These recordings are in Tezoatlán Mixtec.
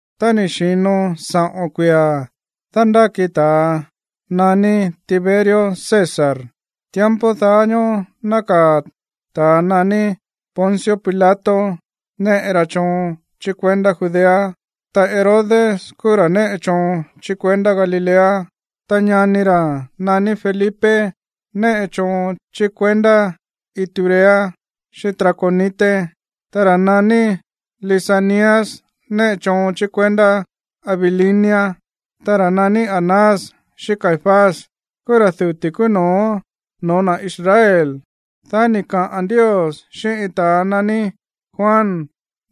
Tá ni̱ xi̱no saꞌo̱n kuia̱ dándáki ta̱a naní Tiberio César, tiempo daá ñóó nákaa̱ ta̱ naní Poncio Pilato néꞌe ra choon chí kuendá Judea, ta Herodes kúú ra̱ néꞌe choon chí kuendá Galilea, ta ñani ra̱ naní Felipe néꞌe choon chí kuendá Iturea xíꞌín Traconite, ta ra̱ naní Lisanias néꞌe choon chí kuendá Abilinia, ta ra̱ naní Anás xíꞌín Caifás kúú ra̱ duti̱ kúú no̱ó noo̱ na̱ Israel. Dá ni̱ kaꞌa̱n Ndios xíꞌín iin ta̱a naní Juan,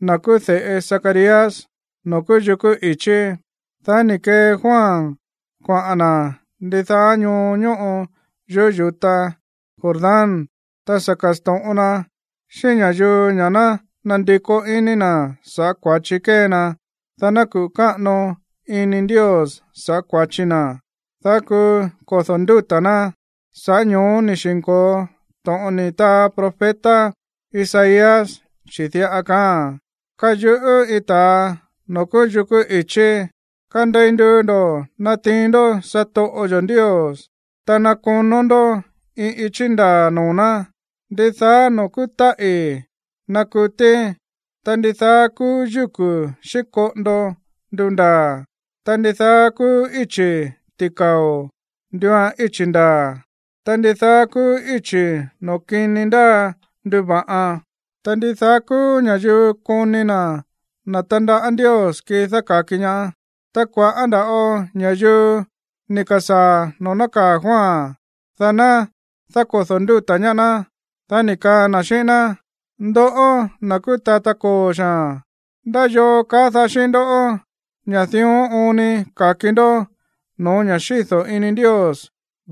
na̱ kúú de̱ꞌe Zacarías, noo̱ kúú yukú i̱chí. Dá ni̱ kee Juan kuaꞌa̱n na̱ ndidaá ñoo ñóꞌo yuꞌú yu̱ta Jordán, ta sa̱ ka̱sto̱ꞌon na xíꞌín ña̱yuu ña̱ ná nandikó iní na̱ sa̱ꞌá kua̱chi kée na, dá ná kuꞌu̱ káꞌano ini Ndios sa̱ꞌá kua̱chi na̱, dá kuu kodo̱ ndúta̱ ná. Sa̱ꞌá ño̱ó ni̱ xi̱nko̱o to̱ꞌon ni̱ taa profeta Isaías, chi̱ diꞌa kaáa̱n: Káyuꞌú iin ta̱a noo̱ kúú yukú i̱chí: “Kandei nduu ndo̱ natiin ndó satoꞌo yo̱ Ndios, ta ná konó ndó iin ichí ndaa̱ noo̱ ná. Ndidaá noo̱ kúú táꞌi̱ ná kutí, ta ndidaá kúú yúku̱ xíꞌín koꞌondo ndundaa̱, ta ndidaá kúú íchi̱ ti̱kao̱ nduuan íchi̱ ndaa̱, ta ndidaá kúú íchi̱ noo̱ kini ndáa nduva̱ꞌan; ta ndidaá kúú ña̱yuu koni na̱ na̱ tandaꞌá Ndios kii dáka̱ki ñaá.” Ta kua̱ꞌá nda̱ꞌo ña̱yuu ni̱ ka̱sáa̱ noo̱ nákaa̱ Juan, dá ná dákodo̱ ndúta̱ ñaá ná. Dá ni̱ kaa na̱ xíꞌín ná: ―Ndoꞌó, na̱ kúú tata koo̱ xaa̱n, ¿ndá yoo kaá daá xíꞌín ndoꞌó ña̱ dión oon ni ka̱ki ndó no̱ó ña̱ xído̱ ini Ndios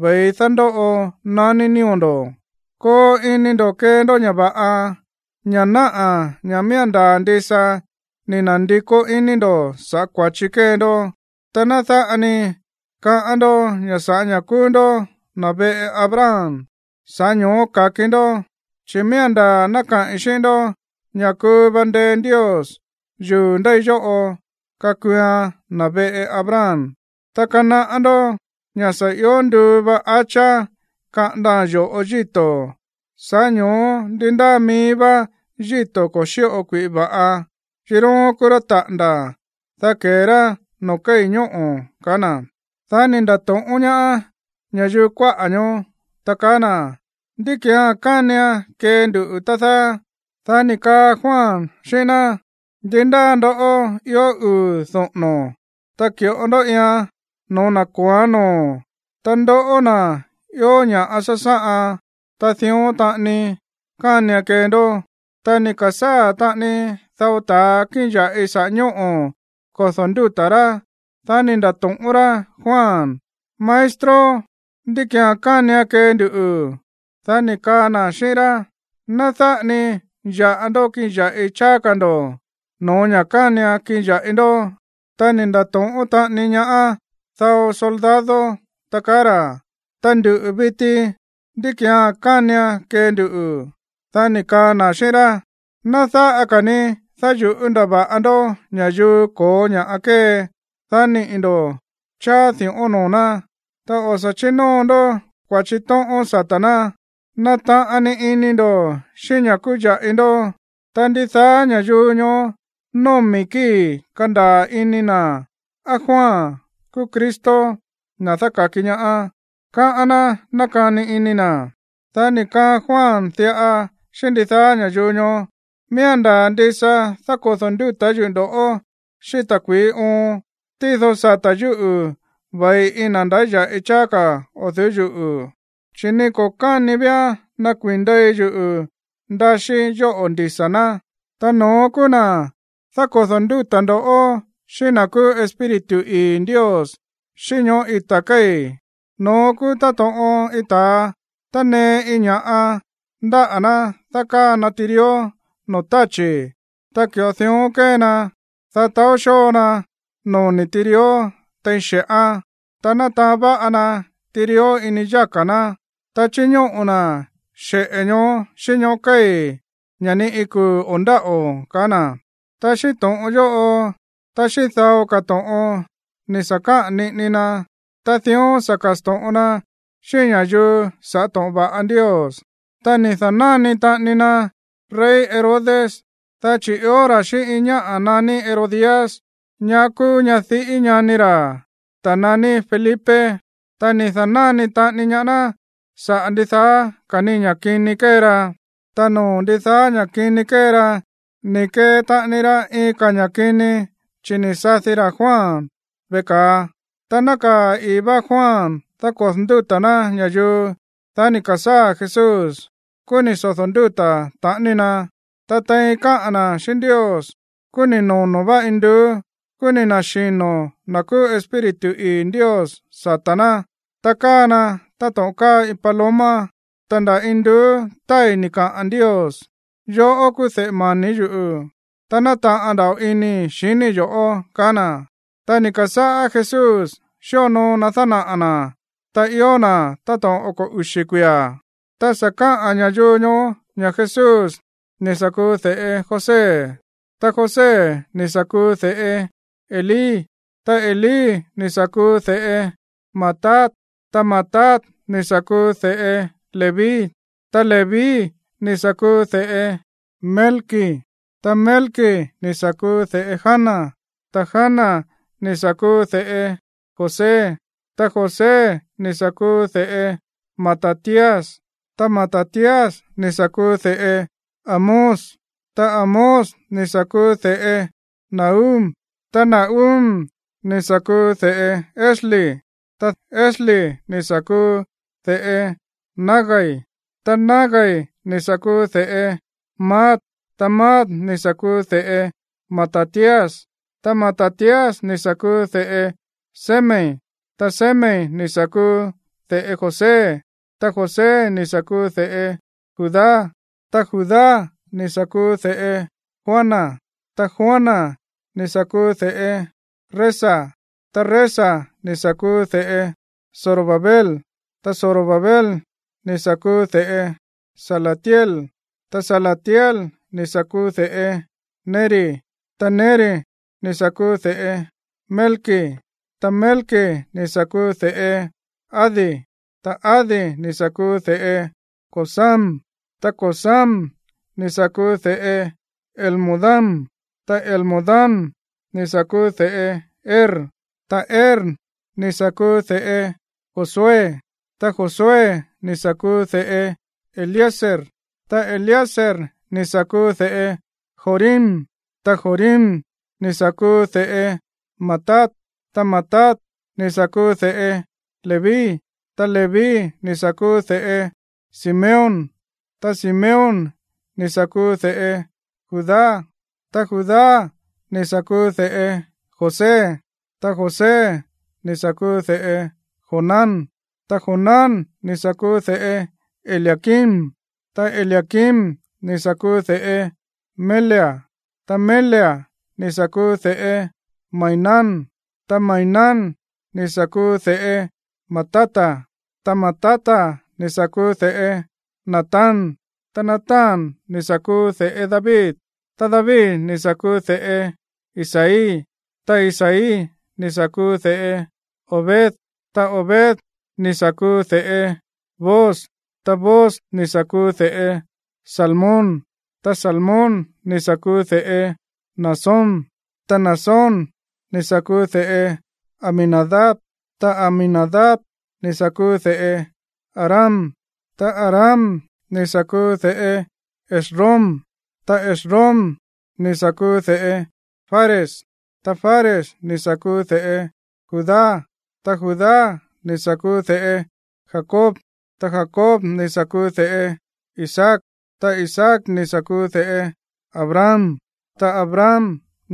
ve̱i dándóꞌo naní nío̱ ndo̱? Koo ini ndo̱ kee ndó ña̱ va̱ꞌa, ña̱ náꞌa̱ ña̱ miía̱n ndaa̱ ndisa ni̱ na̱ndikó iní ndo̱ sa̱ꞌá kua̱chi kée ndó. Ta ná dáꞌa ni kaꞌán ndó ña̱ sa̱ꞌá ña̱ kúú ndó na̱ veꞌe Abraham, sa̱ꞌá ño̱ó ka̱ki ndó. Chi̱ miía̱n ndaa̱ ná kaꞌi̱n xíꞌín ndó ña̱ kuu va ndee Ndios yuu̱ ndéi yóꞌo kakuuan na̱ veꞌe Abraham. Ta kanaꞌá ndó ña̱ sa̱ io nduu va hacha kaꞌandaa̱n yo̱ꞌo yíto̱. Sa̱ꞌá ño̱ó ndi ndáa mií vá yíto̱ ko̱ xíꞌo kui̱ꞌi va̱ꞌa, kiróón kúú ra̱ taꞌa̱nda̱, dá ke̱e rá noo̱ kéi̱ ñóꞌo̱ ―kaá na̱. Dá ni̱ nda̱to̱ꞌón ñaá ña̱yuu kuáꞌa̱ ñoó, ta kaá na̱: ―¿Ndí ki̱án kánian kee nduꞌu̱, tá dáá? Dá ni̱ kaa Juan xíꞌín ná: ―Ndi ndáa ndoꞌó ió uu̱ doꞌo̱no̱, ta ki̱ꞌo ndó iian no̱ó na̱ ko̱óán noo̱. Ta ndoꞌó, na̱ ió ña̱ꞌa sásáꞌan, ta dión taꞌani kánian kee ndó. Ta ni̱ ka̱sáa̱ taꞌani dao ta̱a kíꞌin ya̱ꞌi saꞌa̱ ñóꞌo̱ kodo̱ ndúta̱ rá. Dá ni̱ nda̱to̱ꞌón rá Juan: ―Maestro, ¿ndí ki̱án kánian kee nduꞌu̱? Dá ni̱ kaa na̱ xíꞌín rá: ―Ná dáꞌa ni ya̱ꞌa ndó kiꞌin ya̱ꞌi cháá ka̱ ndo̱ no̱ó ña̱ kánian kiꞌin ya̱ꞌi ndó. Ta ni̱ nda̱to̱ꞌón taꞌani ñaá dao soldado, ta kaá ra̱: ―Ta nduꞌu̱ viti, ¿ndí ki̱án kánian kee nduꞌu̱? Dá ni̱ kaa na̱ xíꞌín rá: ―Ná dáꞌa ka̱ ni dáyu̱ꞌú ndava̱ꞌa ndó ña̱yuu ko̱ó ña̱ꞌa kée, dá niꞌi̱ ndo̱ cháá di̱ꞌón noo̱ ná, ta o̱ sa̱ chínóo ndó kua̱chi tóꞌón sata̱ ná. Nataꞌan ni ini ndo̱ xíꞌín ña̱ kúú ya̱ꞌi ndó. Ta ndidaá ña̱yuu ñoó nómi̱ kíi̱ kandaa̱ ini na̱ á Juan kúú Cristo, na̱ dáka̱ki ñaá, káꞌán ná nákani ini na̱. Dá ni̱ kaa Juan diꞌa xíꞌín ndidaá ña̱yuu ñoó: ―Miía̱n ndaa̱ ndisa dákodo̱ ndúta̱ yuꞌu̱ ndo̱ꞌó xíꞌín ta̱kui̱í oon, tído sata̱ yúꞌu̱ ve̱i iin na̱ ndáya̱ꞌi cháá ka̱ o̱ du̱ú yuꞌu̱, chi̱ ni ko̱ káni víán nakuii̱n ndei yuꞌu̱ ndaxíí yóꞌo̱ ndisa̱ ná. Ta no̱ón kúú na̱ dákodo̱ ndúta̱ ndo̱ꞌó xíꞌín na̱ kúú Espíritu ii̱ Ndios xíꞌín ñoꞌó ita̱ kéi̱. No̱ón kúú táto̱ꞌon iin ta̱a tánee iin ña̱ꞌa ndáꞌa̱ ná dákáa na tirió noo̱ táchi̱. Ta ki̱ꞌo dión kée na, dá taó xóo na noni̱ tirió tein xe̱ꞌán. Ta nataán va̱ꞌa na tirió ini yáka̱ ná, ta chiñóꞌo̱ na̱ xeꞌe̱ ñoó xíꞌín ñóꞌo̱ kéi̱, ña̱ ni iin kuu̱ o̱ ndáꞌo̱ ―kaá na̱. Ta xíꞌín to̱ꞌon yóꞌo, ta xíꞌín dao ka̱ to̱ꞌon ni̱ sa̱ kaꞌa̱n niꞌini na, ta dión sa̱ ka̱sto̱ꞌon na xíꞌín ña̱yuu sa̱ꞌá to̱ꞌon va̱ꞌa Ndios. Ta ni̱ da̱náni taꞌani na rey Herodes, dá chi̱ ió ra̱ xíꞌín iin ñáꞌa̱ naní Herodías, ñá kúú ñadiꞌí ñani ra̱, ta̱ naní Felipe. Ta ni̱ da̱náni taꞌani ñaá ná saꞌa̱ ndidaá ka̱ ni ña̱ kini kée ra. Ta noo̱ ndidaá ña̱ kini kée ra, ni̱ kee taꞌani ra iin ka̱ ña̱ kini, chi̱ ni̱ sadi ra̱ Juan veꞌe ka̱a. Tá nákaa̱ i̱í vá Juan dákodo̱ ndúta̱ ná ña̱yuu, dá ni̱ ka̱sáa̱ Jesús, kúú ni̱ sodo̱ ndúta̱ taꞌani na. Ta tein káꞌa̱n na̱ xíꞌín Ndios, kúú ni̱ nono̱ vá induú, kúú ni̱ na̱xino̱ na̱ kúú Espíritu ii̱ Ndios sata̱ ná, ta káa na táto̱ꞌon káa iin paloma. Ta nda̱ induú tái̱ ni̱ kaꞌa̱n Ndios: ―Yoꞌó kúú de̱ꞌe mani̱ yuꞌu̱, ta nátaꞌan nda̱ꞌo inii̱ xiníi̱ yo̱ꞌó ―kaá na̱. Ta ni̱ ka̱sáꞌá Jesús xíonoo na dánaꞌa̱ na̱ tá ió na̱ táto̱ꞌon oko̱ uxi̱ kuia̱. Ta sa̱ kaꞌán ña̱yuu ñoó ña̱ Jesús ni̱ sa̱ kuu de̱ꞌe José, ta José ni̱ sa̱ kúú de̱ꞌe Elí, ta Elí ni̱ sa̱ kuu de̱ꞌe Matat, ta Matat ni̱ sa̱ kuu de̱ꞌe Leví, ta Leví ni̱ sa̱ kuu de̱ꞌe Melqui, ta Melqui ni̱ sa̱ kuu de̱ꞌe Jana, ta Jana ni̱ sa̱ kuu de̱ꞌe José, ta José ni̱ sa̱ kuu de̱ꞌe Matatías, ta Matatías ni̱ sa̱ kuu de̱ꞌe Amós, ta Amós ni̱ sa̱ kuu de̱ꞌe Nahum, ta Nahum ni̱ sa̱ kuu de̱ꞌe Esli, ta Esli ni̱ sa̱ kuu de̱ꞌe Nagai, ta Nagai ni̱ sa̱ kuu de̱ꞌe Maat, ta Maat ni̱ sa̱ kuu de̱ꞌe Matatías, ta Matatías ni̱ sa̱ kuu de̱ꞌe Semei, ta Semei ni̱ sa̱ kuu de̱ꞌe José, ta José ni̱ sa̱ kuu de̱ꞌe Judá, ta Judá ni̱ sa̱ kuu de̱ꞌe Joana, ta Joana ni̱ sa̱ kuu de̱ꞌe Resa, ta Resa ni̱ sa̱ kuu de̱ꞌe Zorobabel, ta Zorobabel ni̱ sa̱ kuu de̱ꞌe Salatiel, ta Salatiel ni̱ sa̱ kuu de̱ꞌe Neri, ta Neri ni̱ sa̱ kuu de̱ꞌe Melqui, ta Melqui ni̱ sa̱ kuu de̱ꞌe Adi, ta Adi ni̱ sa̱ kuu de̱ꞌe Cosam, ta Cosam ni̱ sa̱ kuu de̱ꞌe Elmodam, ta Elmodam ni̱ sa̱ kuu de̱ꞌe Er, ta Er ni̱ sa̱ kuu de̱ꞌe Josué, ta Josué ni̱ sa̱ kuu de̱ꞌe Eliezer, ta Eliezer ni̱ sa̱ kuu de̱ꞌe Jorim, ta Jorim ni̱ sa̱ kuu de̱ꞌe Matat, ta Matat ni̱ sa̱ kuu de̱ꞌe Leví, ta Leví ni̱ sa̱ kuu de̱ꞌe Simeón, ta Simeón ni̱ sa̱ kuu de̱ꞌe Judá, ta Judá ni̱ sa̱ kuu de̱ꞌe José, ta José ni̱ sa̱ kuu de̱ꞌe Jonán, ta Jonán ni̱ sa̱ kuu de̱ꞌe Eliaquim, ta Eliaquim ni̱ sa̱ kuu de̱ꞌe Melea, ta Melea ni̱ sa̱ kuu de̱ꞌe Mainán, ta Mainán ni̱ sa̱ kuu de̱ꞌe Matata, ta Matata ni̱ sa̱ kuu de̱ꞌe Natán, ta Natán ni̱ sa̱ kuu de̱ꞌe David, ta David ni̱ sa̱ kuu de̱ꞌe Isaí, ta Isaí ni̱ sa̱ kuu de̱ꞌe Obed, ta Obed ni̱ sa̱ kuu de̱ꞌe Booz, ta Booz ni̱ sa̱ kuu de̱ꞌe Salmón, ta Salmón ni̱ sa̱ kuu de̱ꞌe Naasón, ta Naasón ni̱ sa̱ kuu de̱ꞌe Aminadab, ta Aminadab ni̱ sa̱ kuu de̱ꞌe Aram, ta Aram ni̱ sa̱ kuu de̱ꞌe Esrom, ta Esrom ni̱ sa̱ kuu de̱ꞌe Fares, ta Fares ni̱ sa̱ kuu de̱ꞌe Judá, ta Judá ni̱ sa̱ kuu de̱ꞌe Jacob, ta Jacob ni̱ sa̱ kuu de̱ꞌe Isaac, ta Isaac ni̱ sa̱ kuu de̱ꞌe Abraham, ta Abraham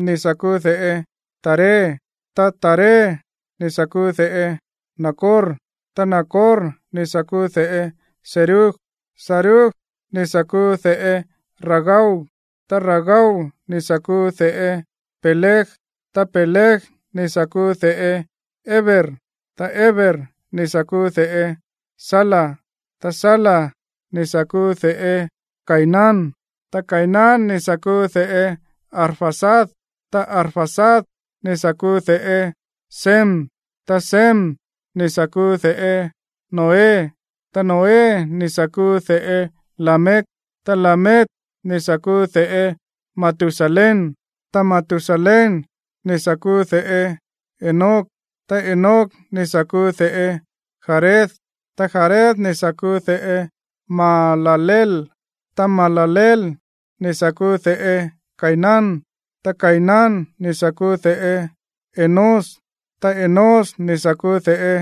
ni̱ sa̱ kuu de̱ꞌe Taré, ta Taré ni̱ sa̱ kuu de̱ꞌe Nacor, ta Nacor ni̱ sa̱ kuu de̱ꞌe Serug, ta Serug ni̱ sa̱ kuu de̱ꞌe Ragau, ta Ragau ni̱ sa̱ kuu de̱ꞌe Peleg, ta Peleg ni̱ sa̱ kuu de̱ꞌe Heber, ta Heber ni̱ sa̱ kuu de̱ꞌe Sala, ta Sala ni̱ sa̱ kuu de̱ꞌe Cainán, ta Cainán ni̱ sa̱ kuu de̱ꞌe Arfaxad, ta Arfaxad ni̱ sa̱ kuu de̱ꞌe Sem, ta Sem ni̱ sa̱ kuu de̱ꞌe Noé, ta Noé ni̱ sa̱ kuu de̱ꞌe Lamec, ta Lamec ni̱ sa̱ kuu de̱ꞌe Matusalén, ta Matusalén ni̱ sa̱ kuu de̱ꞌe Enoc, ta Enoc ni̱ sa̱ kuu de̱ꞌe Jared, ta Jared ni̱ sa̱ kuu de̱ꞌe Mahalaleel, ta Mahalaleel ni̱ sa̱ kuu de̱ꞌe Cainán, ta Cainán ni̱ sa̱ kuu de̱ꞌe Enós, ta Enós ni̱ sa̱ kuu de̱ꞌe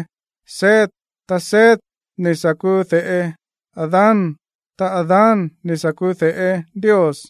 Set, ta Set ni̱ sa̱ kuu de̱ꞌe Adán, ta Adán ni̱ sa̱ kuu de̱ꞌe Ndios.